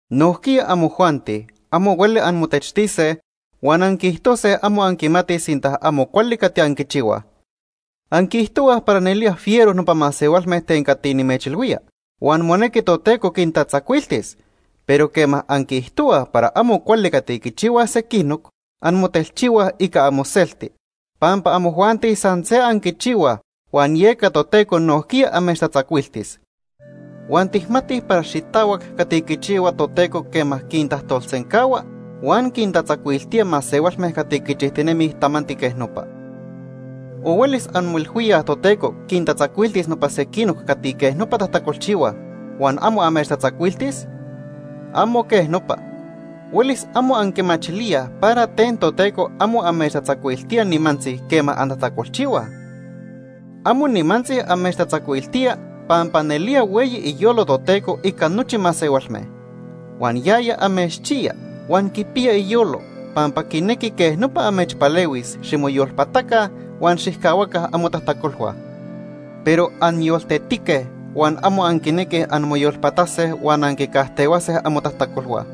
Nojquiya amojuanti amo hueli anmotechtise huan anquiijtose amo anquimatij sinta amo cuali cati anquichihuaj. Anquiijtohuaj para nelía fiero nopa masehualme ten cati nimechilhuía, huan monequi Toteco quintatzacuiltis, pero quema anquiijtohuaj para amo cuali cati quichihuaj sequinoc, anmotelchihuaj ica amoselti, pampa amojuanti san se anquichihuaj huan yeca Toteco nojquiya amechtatzacuiltis. Huan tijmatij para xitahuac cati quichihua Toteco quema quintajtolsencahua huan quintatzacuiltía masehualme cati quichijtinemij tamanti quej nopa. ¿O huelis anmoilhuíaj Toteco quintatzacuiltis nopa sequinoc cati quej nopa tajtacolchihuaj huan amo amechtatzacuiltis? ¡Amo quej nopa! Huelis amo anquimachilíaj para ten Toteco amo amechtatzacuiltía nimantzi quema antajtacolchihuaj. Amo nimantzi amechtatzacuiltía pampa nelía hueyi iyolo Toteco ica nochi masehualme. Huan yaya amechchiya huan quipiya iyolo, pampa quinequi quej nopa amechpalehuis ximoyolpataca huan xijcahuaca amotajtacolhua. Pero anyoltetique huan amo anquinequij anmoyolpatase huan anquicajtehuase amotajtacolhua.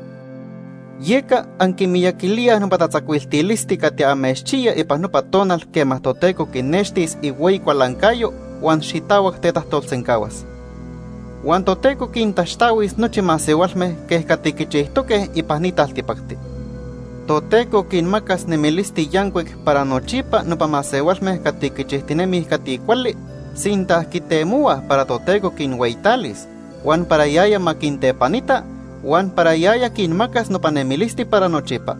Yeca anquimiyaquilíaj nopa tatzacuiltilisti cati amechchiya ipan nopa tonal quema Toteco quinextis ihueyi cualancayo huan xitahuac tetajtolsencahuas. Huan Toteco quintaxtahuis nochi masehualme quej cati quichijtoque ipan ni taltipacti. Toteco quinmacas nemilisti yancuic para nochipa nopa masehualme cati quichijtinemij cati cuali, sinta quitemohuaj para Toteco quinhueyitalis, huan para yaya ma quintepanita, huan para yaya quinmacas nopa nemilisti para nochipa.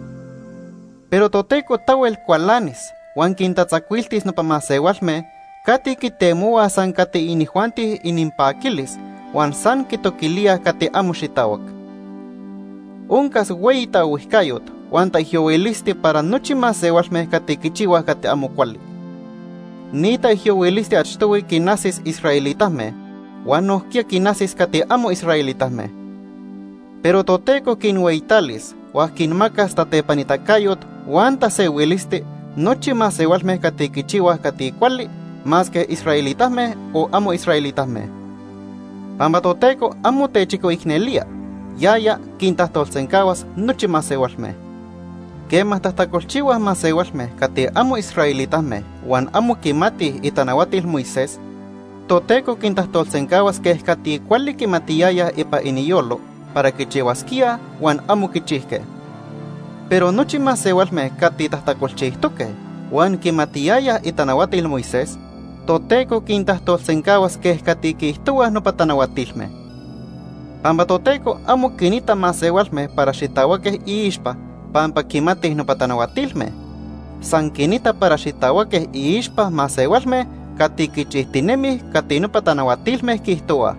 Pero Toteco tahuel cualanis huan quintatzacuiltis nopa masehualme cati quitemohuaj san cati inijuanti ininpaquilis huan san quitoquilíaj cati amo xitahuac. Oncas hueyi taohuijcayot huan taijyohuilisti para nochi masehualme cati quichihuaj cati amo cuali. Ni taijyohuilisti achtohui quinajsis israelitame huan nojquiya quinajsis cati amo israelitame. Pero Toteco quinhueyitalis huan quinmacas tatepanitacayot huan tasehuilisti nochi masehualme cati quichihuaj cati cuali, masque israelitame o amo israelitame. Pampa Toteco amo techicoicnelía; yaya quintajtolsencahuas nochi masehualme. Quema tajtacolchihuaj masehualme cati amo israelitame huan amo quimatij itanahuatil Moisés, Toteco quintajtolsencahuas quej cati cuali quimatiyayaj ipan iniyolo para quichihuasquíaj huan amo quichijque. Pero nochi masehualme cati tajtacolchijtoque huan quimatiyayaj itanahuatil Moisés, Toteco quintajtolsencahuas quej cati quiijtohuaj nopa tanahuatilme. Pampa Toteco amo quinita masehualme para xitahuaque iixpa pampa quimatij nopa tanahuatilme. San quinita para xitahuaque iixpa masehualme cati quichijtinemij cati nopa tanahuatilme quiijtohuaj.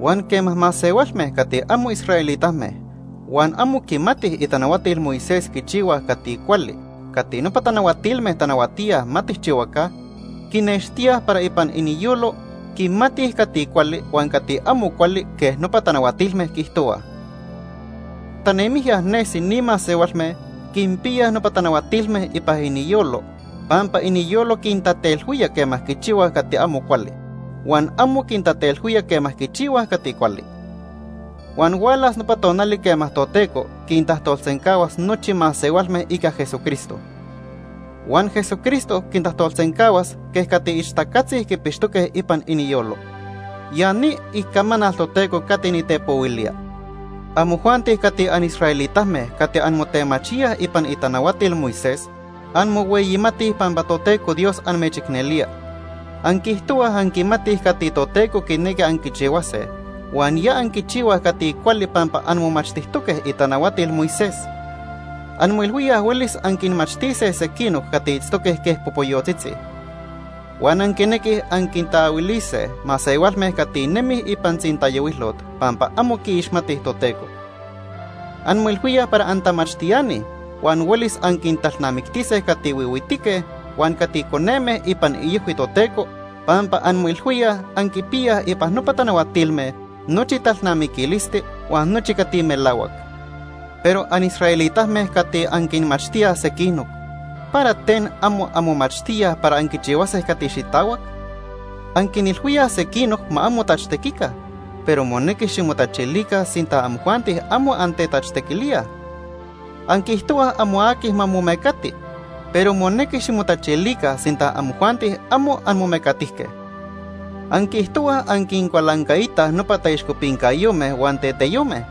Huan quema masehualme cati amo israelitame huan amo quimatij itanahuatil Moisés quichihuaj cati cuali cati nopa tanahuatilme tanahuatíaj ma tijchihuaca, quinextíaj para ipan iniyolo quimatij cati cuali huan cati amo cuali quej nopa tanahuatilme quiijtohuaj. Tanemijya nesi ni masehualme quinpiyaj nopa tanahuatilme ipan iniyolo pampa iniyolo quintatelhuía quema quichihuaj cati amo cuali, huan amo quintatelhuía quema quichihuaj cati cuali. Huan hualas nopa tonali quema Toteco quintajtolsencahuas nochi masehualme ica Jesucristo. Huan Jesucristo quintajtolsencahuas quej cati ixtacatzi quipixtoque ipan iniyolo. Ya ni icamanal Toteco cati nitepohuilía. Amojuanti cati anisraelitame cati anmotemachíaj ipan itanahuatil Moisés, anmohueyimatij pampa Toteco Dios amechicnelía. Anquiijtohuaj anquimatij cati Toteco quinequi anquichihuase huan ya anquichihuaj cati cuali pampa anmomachtijtoque itanahuatil Moisés. Anmoilhuíaj huelis anquinmachtise sequinoc cati itztoque quej popoyotzitzi. Huan anquinequij anquintaahuilise masehualme cati nemij ipan tzintayohuilot pampa amo quiixmatij Toteco. Anmoilhuíaj para antamachtiani huan huelis anquintalnamictise cati huihuitique huan cati coneme ipan iojhui Toteco, pampa anmoilhuíaj anquipiyaj ipan nopa tanahuatilme nochi talnamiquilisti huan nochi cati melahuac. Pero anisraelitame cati anquinmachtíaj sequinoc, ¿para ten amo anmomachtíaj para anquichihuase cati xitahuac? Anquinilhuíaj sequinoc ma amo tachtequica, pero monequi ximotachilica sinta amojuanti amo antetachtequilíaj. Anquiijtohuaj amo aqui ma momecati, pero monequi ximotachilica sinta amojuanti amo anmomecatijque. Anquiijtohuaj anquincualancaitaj nopa taixcopincayome huan teteyome,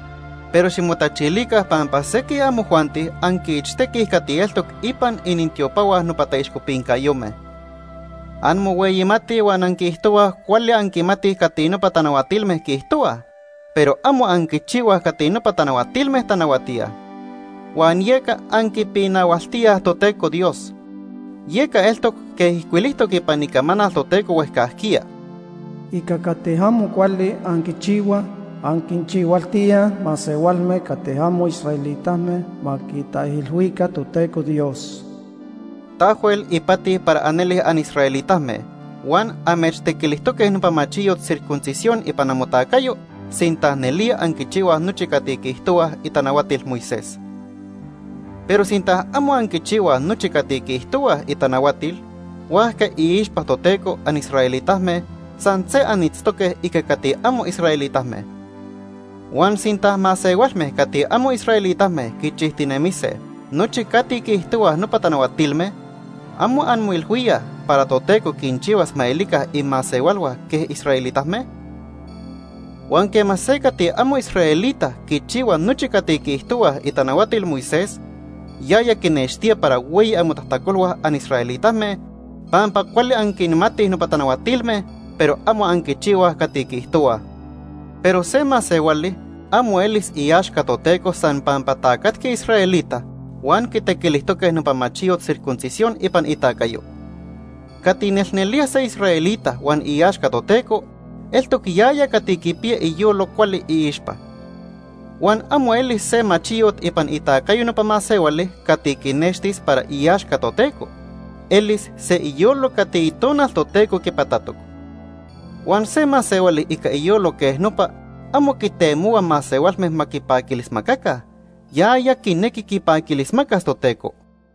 pero ximotachilica pampa sequij amojuanti anquiichtequij cati eltoc ipan inintiopahua nopa taixcopincayome. Anmohueyimatij huan anquiijtohuaj cuali anquimatij cati nopa tanahuatilme quiijtohuaj, pero amo anquichihuaj cati nopa tanahuatilme tanahuatíaj. Huan yeca anquipinahualtíaj Toteco Dios. Yeca eltoc quej ijcuilijtoc ipan Icamanal Toteco huejcajquiya: “Ica cati amo cuali anquichihuaj, anquinchihualtíaj masehualme cati amo israelitame ma quitaijilhuica Toteco Dios.” Tahuel ipati para anelij anisraelitame huan amechtequilijtoque nopa machiyot circuncisión ipan amotacayo sinta nelía anquichihuaj nochi cati quiijtohuaj itanahuatil Moisés. Pero sinta amo anquichihuaj nochi cati quiijtohuaj itanahuatil, huajca iixpa Toteco anisraelitame san se anitztoque ica cati amo israelitame. Huan sinta masehualme cati amo israelitame quichijtinemise nochi cati quiijtohuaj nopa tanahuatilme, ¿amo anmoilhuíaj para Toteco quinchihuas ma elica imasehualhua quej israelitame? Huan quema se cati amo israelita quichihua nochi cati quiijtohuaj itanahuatil Moisés, yaya quinextía para hueyi amotajtacolhua anisraelitame pampa cuali anquinmatij nopa tanahuatilme, pero amo anquichihuaj cati quiijtohuaj. Pero se masehuali amo elis iaxca Toteco san pampa tacatqui israelita huan quitequilijtoque nopa machiyot circuncisión ipan itacayo. Cati nelnelía se israelita huan iaxca Toteco, eltoc yaya cati quipiya iyolo cuali iixpa. Huan amo elis se machiyot ipan itacayo nopa masehuali cati quinextis para iaxca Toteco, elis se iyolo cati Itonal Toteco quipatatoc. Huan se masehuali ica iyolo quej nopa amo quitemohua masehualme ma quipaquilismacaca, yaya quinequi quipaquilismacas Toteco.